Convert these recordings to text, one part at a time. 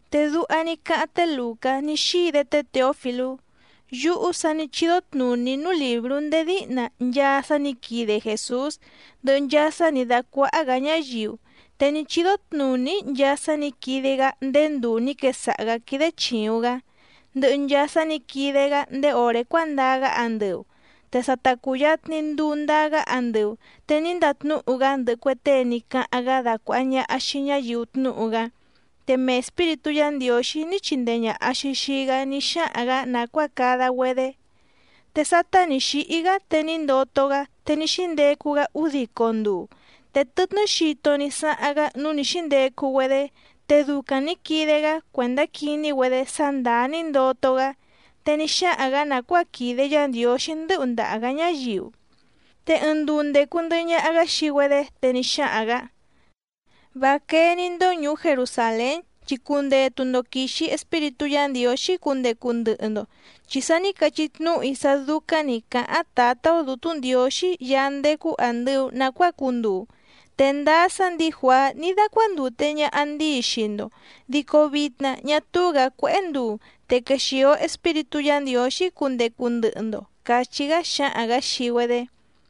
Te duha ní cáháⁿ té Lùcá ní xíi‑dé té Těofilú: Yúhú sa ní chídó tnùní‑í núú lìbrú ndéé díhna nchaa sá nǐ quide Jèsús, ndɨhɨ nchaa sá nǐ dácuáhá‑gǎ ñáyiu. Te ní chídó tnùní‑í nchaa sá nǐ quide‑gá ndéé nduu nǐ quesaha‑gǎ quídé chìuⁿ‑gá, ndɨhɨ nchaa sá nǐ quide‑gá ndéé òré cuándaa‑gá andɨu. Te sa ta cùyatni nduu ndaa‑gá andɨu, te ní ndatnúhu‑gá ndɨhɨ cue tée ní cáháⁿ‑gá dacuàha ñaha xii ñáyiu tnúhu‑gá, te mee Espíritú Yǎ Ndiǒxí ní chindee ñàha‑xi xii‑gá ní xáhaⁿ‑gǎ nàcuáa cada‑güedé. Te sátá nǐ xíhí‑gá te ní ndoto‑gá, te ní xíndecu‑gá údico nduu. Te tɨtnɨ́ xito ní sáháⁿ‑gá núú nǐ xíndecu‑güedé, te ducaⁿ nǐ quide‑gá cuèndá quiní‑güedé sá ndàá ní ndoto‑gá, te ní xáhaⁿ‑gǎ nàcuáa quìde Yá Ndiǒxí ndɨ̌hu ndaha‑gǎ ñáyiu. Te ɨɨⁿ nduu ndècu ndɨhɨ ñaha‑gá xii‑güedé, te ní xáhaⁿ‑gǎ: —Vá quéé‑ní‑ndó ñùú Jerusàlén, chi cundetu‑ndo quìxi Espíritú Yǎ Ndiǒxí cundecu ndɨhɨ‑ndo, chi sa ní cachí tnúhu‑í sá dúcáⁿ nǐ cáháⁿ Tǎtá‑ó Dǔtú Ndiǒxí Yaá ndécú àndɨu nacuáa cunduu. Te ndáá sá ndǐi Juàá ní dácuándùte ñaha ndíi xii‑ndo, dico vitna ñá túú‑gǎ cuéhé nduu, te quexìo Espíritú Yǎ Ndiǒxí cundecu ndɨhɨ‑ndo —càchí‑gá xáhaⁿ‑gǎ xii‑güedé.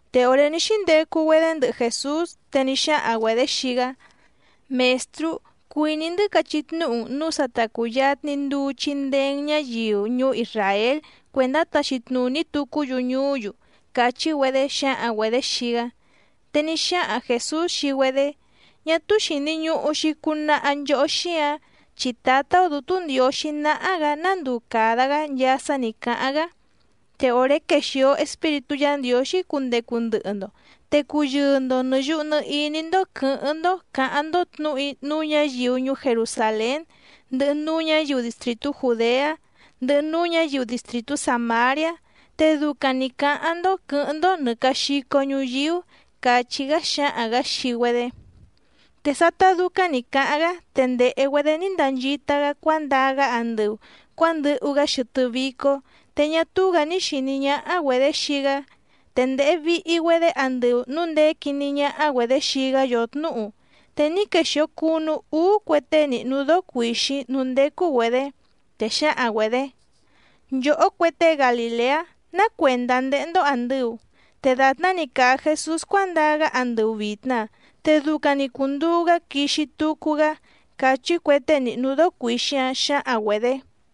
Te òré ní xíndecu‑güedé ndɨhɨ Jèsús, te ní xáhaⁿ‑güedě xii‑gá: —Mèstrú, cuìní‑ndɨ́ cachí tnúhu‑n nǔu sa ta cùyatni nduu chindee‑n ñáyiu ñuú Isràél cuèndá taxi tnùní tucú‑yu ñuú‑yu —càchí‑güedé xǎhaⁿ‑güedě xii‑gá. Te ní xáhaⁿ Jèsús xii‑güedé: —Ñá túú xìni ñuhu‑xi cunaha nchohó xíǎⁿ, chi Tǎtá‑ó Dǔtú Ndiǒxí náhá‑gǎ ná nduu càda‑gá nchaa sá nǐ cáháⁿ‑gá. Te òré quexìo Espíritú Yǎ Ndiǒxí cundecu ndɨhɨ‑ndo, te cuyɨɨ‑ndo nɨ̀ yuhu nɨ iní‑ndó quɨ̌hɨ́ⁿ‑ndó cǎháⁿ‑ndó tnǔhu‑í núú ñǎyiu ñuú Jerusàlén ndɨhɨ núú ñǎyiu distrìtú Jùdeá ndɨhɨ núú ñǎyiu distrìtú Sàmariá. Te ducaⁿ‑ni cǎháⁿ‑ndó quɨ̌hɨ́ⁿ‑ndó nɨ̀ caxico ñuyíú —càchí‑gá xáhaⁿ‑gǎ xii‑güedé. Te sátá dúcáⁿ nǐ cáháⁿ‑gá, te ndèhe‑güedé ní ndanchita‑gá cuándaa‑gá andɨu cuǎndɨhu‑gá xɨtɨ́ vícó, te ñá túú‑gǎ ní xìní ñáhá‑güedě xii‑gá. Te ndèhe vihi‑güedé andɨu núu ndèé quiní ñáhá‑güedě xii‑gá yòtnúhu, te ní quexìo cunu úú cue tée nìhnu dóó cuìxíⁿ núú ndécú‑güedě. Te xǎhaⁿ‑güedě: —Nchòhó cue tée Galìleá, ¿ná cuèndá ndéhé‑ndó àndɨu? Te dàtná‑ni càa Jesús cuándaa‑gá andɨu vìtna, te ducaⁿ‑ni cùnduu‑gá quixi tucu‑gá —càchí cue tée nìhnu dóó cuìxíⁿ‑áⁿ xǎhaⁿ‑güedě.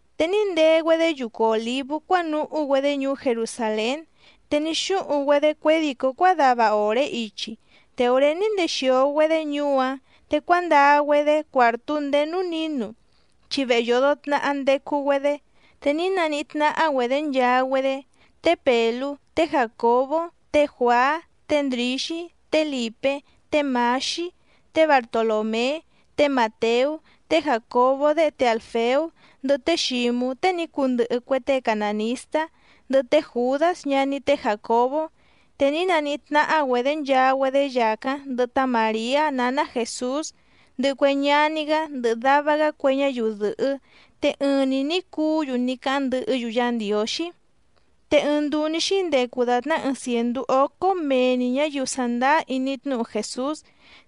Te ní ndee‑güedé yucu Òlívú cuánuhú‑güedé ñuú Jerusàlén, te ní xúhuⁿ‑güedé cuědìcó cuádava òré ichi. Te òré ní ndexìo‑güedé ñuú‑áⁿ, te cuándaa‑güedé cuàrtú ndéé núú nǐnu, chi vehe yòdo tnaha ndecu‑güedé. Te ní naníhí tnáhá‑güedě nchaa‑güedé té Pèlú, té Jàcobó, té Juàá, té Ndrǐxí, té Lìpé, té Mǎxí, té Bartolòmé, té Màteú, té Jàcobó déhe té Àlfeú, ndɨhɨ té Xǐmú tée ní cundɨhɨ cue tée canànistá, ndɨhɨ té Jùdás ñaní té Jàcobó. Te ní naníhí tnáhá‑güedě nchaa‑güedé yàcáⁿ ndɨhɨ tá Màriá nǎná Jèsús, ndɨhɨ cue ñaní‑gá ndɨhɨ dava‑gá cue ñáyiu dɨ̀hɨ́. Te ɨɨⁿ‑ni nǐ cuú‑yu ní cáháⁿ ndɨhɨ́‑yu Yá Ndiǒxí. Te ɨɨⁿ nduu ní xíndecu dàtná ɨɨⁿ cièndú ócó mee‑ni ñǎyiu sàndáá iní tnúhu Jèsús,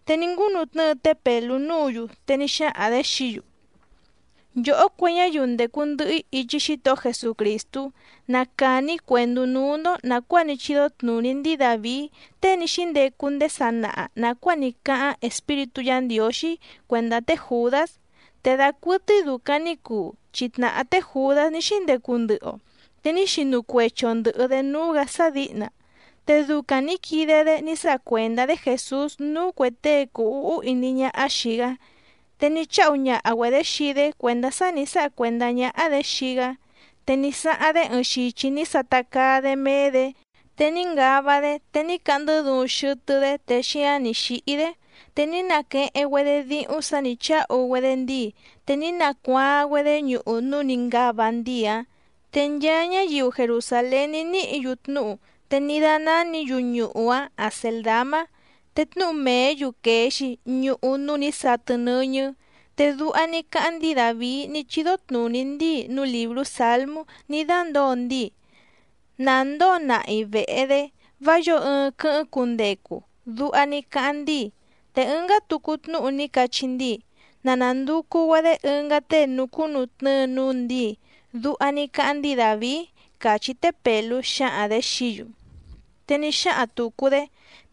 te ní ngúnutnɨ́ɨ té Pèlú núǔ‑yu, te ní xáhaⁿ‑dě xií‑yu: —Nchòhó cue ñáyiu ndècu ndɨhɨ‑í ichi Xítohó Jesucrìstú, na càni‑í cuèndú núú‑ndó nàcuáa ní chídó tnùní ndíi Dàvií tée ní xíndecu ndéé sanaha nàcuáa ní cáháⁿ Espíritú Yǎ Ndiǒxí cuèndá té Jùdás. Te dacuɨtɨ́í dùcaⁿ ní cuu, chi tnàhá té Jùdás ní xíndecu ndɨhɨ‑o, te ní xinu cuechi‑o ndɨ̀hɨ‑dé núú‑gǎ sá dǐhna, te ducaⁿ nǐ quide‑dé ní sáha cuèndá‑dé Jèsús núú cuè tée cùu úhú iní ñáhá xìi‑gá. Te ní cháhu ñaha‑güedě xii‑dé cuèndá sá nǐ sáha cuèndá ñáhá‑dě xii‑gá. Te ní sáháⁿ‑dé ɨɨⁿ xichi ní sata caa‑dé méé‑dě, te ní ngava‑dé, te ní cahndɨ́ duuⁿ xɨtɨ́‑dé te xíáⁿ nǐ xíhí‑dé. Te ní naqueheⁿ‑güedé díhúⁿ sǎ nǐ cháhu‑güedé ndíi, te ní nacuaaⁿ‑güedé ñuhu núú nǐ ngava ndíi‑áⁿ. Te nchaa ñáyiu Jerusàlén ní níhǐ‑yu tnúhu, te ní dánánǐ‑yu ñuhu‑áⁿ Acèldamá. Te tnúhu mèé‑yu quèe‑xi: Ñuhu núú nǐ satɨ nɨ́ñɨ́. Te duha ní cáháⁿ ndíi Dàvií ní chídó tnùní ndíi núú lìbrú Sǎlmú ní dándǒo ndíi: “Nà ndóo nahi vèhe‑dé, vá yǒo ɨɨⁿ quɨ́hɨ́ⁿ cundecu”, duha ní cáháⁿ ndíi. Te ɨngá tucu tnúhu ní cachí ndíi: “Na nànducu‑güedé ɨngá tée nucúnutnɨ́ɨ núú ndǐi”, duha ní cáháⁿ ndíi Dàvií —càchí té Pèlú xǎhaⁿ‑dě xií‑yu. Te ní xáhaⁿ tùcu‑dé: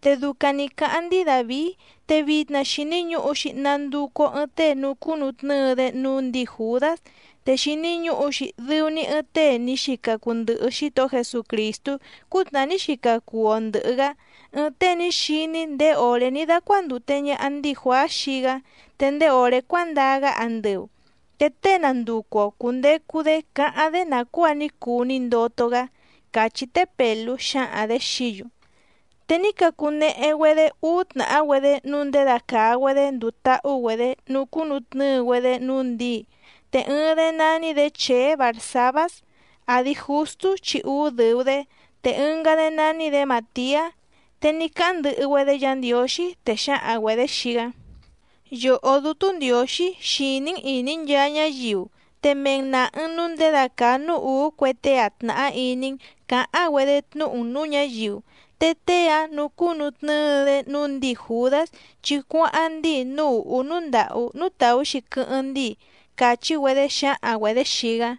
—Te ducaⁿ nǐ cáháⁿ ndíi Dàvií, te vitna xìni ñuhu‑xi nanducu‑o ɨɨⁿ tée nucúnutnɨ́ɨ‑dé núú ndǐi Jùdás, te xìni ñuhu‑xi dɨu‑ni ɨɨⁿ tée ní xica cuu ndɨhɨ Xítohó Jesucrìstú cútnàhá ní xica cuu‑o ndɨ̀hɨ‑gá, ɨɨⁿ tée ní xiní ndéé òré ní dácuándùte ñaha ndíi Juàá xii‑gá, te ndéé òré cuándaa‑gá andɨu. Te tée nanducu‑o cùndecu‑dé cáháⁿ‑dé nàcuáa ní cuu ní ndoto‑gá —càchí té Pèlú xǎhaⁿ‑dě xií‑yu. Te ní cacunehe‑güedé úú tnàhá‑güedé nǔu ndědacàa‑güedé nduu táhú‑güedě nucúnutnɨ́ɨ‑güedé núú ndǐi. Te ɨɨⁿ‑dé nání‑dě Chèé Barsàbás, àdi Justú chi úú dɨ̀u‑dé, te ɨngá‑dé nání‑dě Màtiá. Te ní cáháⁿ ndɨhɨ‑güedé Yǎ Ndiǒxí, te xǎhaⁿ‑güedě xii‑gá: —Yòhó Dútú Ndiǒxí xìní‑n ìní nchaa ñáyiu, te mee‑n nàha‑n núu nděda càa núú ùú cue tée‑a tnàhá iní‑n cǎháⁿ‑güedé tnúhu‑n nǔú ñǎyiu, te tée‑áⁿ nucúnutnɨ́ɨ‑dé núú ndǐi Jùdás, chi cuáháⁿ ndíi núú ùhú núú ndàhú núú tàú‑xi quɨ́hɨ́ⁿ ndíi —càchí‑güedé xǎhaⁿ‑güedě xii‑gá.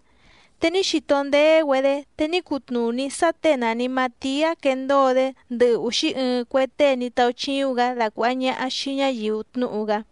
Te ní xito ndéé‑güedé, te ní cutnùní sá těe nàni Matiá quendóo‑dé ndɨhɨ úxí ɨɨⁿ cue tée ní táúchíúⁿ‑gǎ dacuàha ñaha xii ñáyiu tnúhu‑gá.